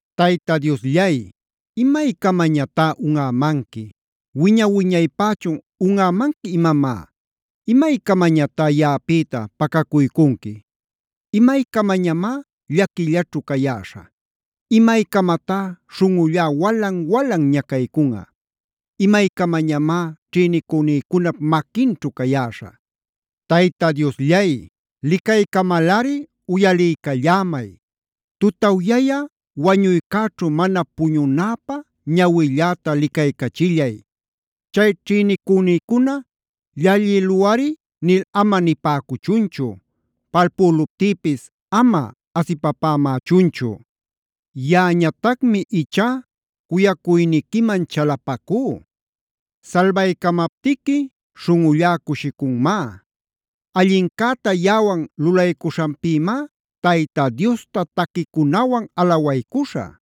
Tayta Diosllay, ¿imaycamañatá unꞌämanqui? ¿Wiña-wiñaypächun unꞌämanqui imamá? ¿Imaycamañatá yaꞌapïta pacacuycunqui? ¿Imaycamañamá llaquillaćhu cayäśhä? ¿Imaycamatá śhunꞌullá walan-walan ñacaycunꞌa? ¿Imaycamañamá ćhïnicünïcunap maquinćhu cayäśhä? Tayta Diosllay, licaycamalꞌari uyaliycallämay. Tutawyä wañuycäćhu mana puñunäpä ñawilläta licaycachillay. Chay ćhïnicünïcuna “llallïluꞌari” nil ama nipäcuchunchu. Palpüluptïpis ama asipapämächunchu. Yaꞌañatacmi ichá cuyacuyniquiman chalapacú. Salbaycamaptiqui śhunꞌullá cushicunmá. Allincäta yaꞌawan lulaycuśhanpïmá Tayta Diosta taquicunawan alawaycuśhä.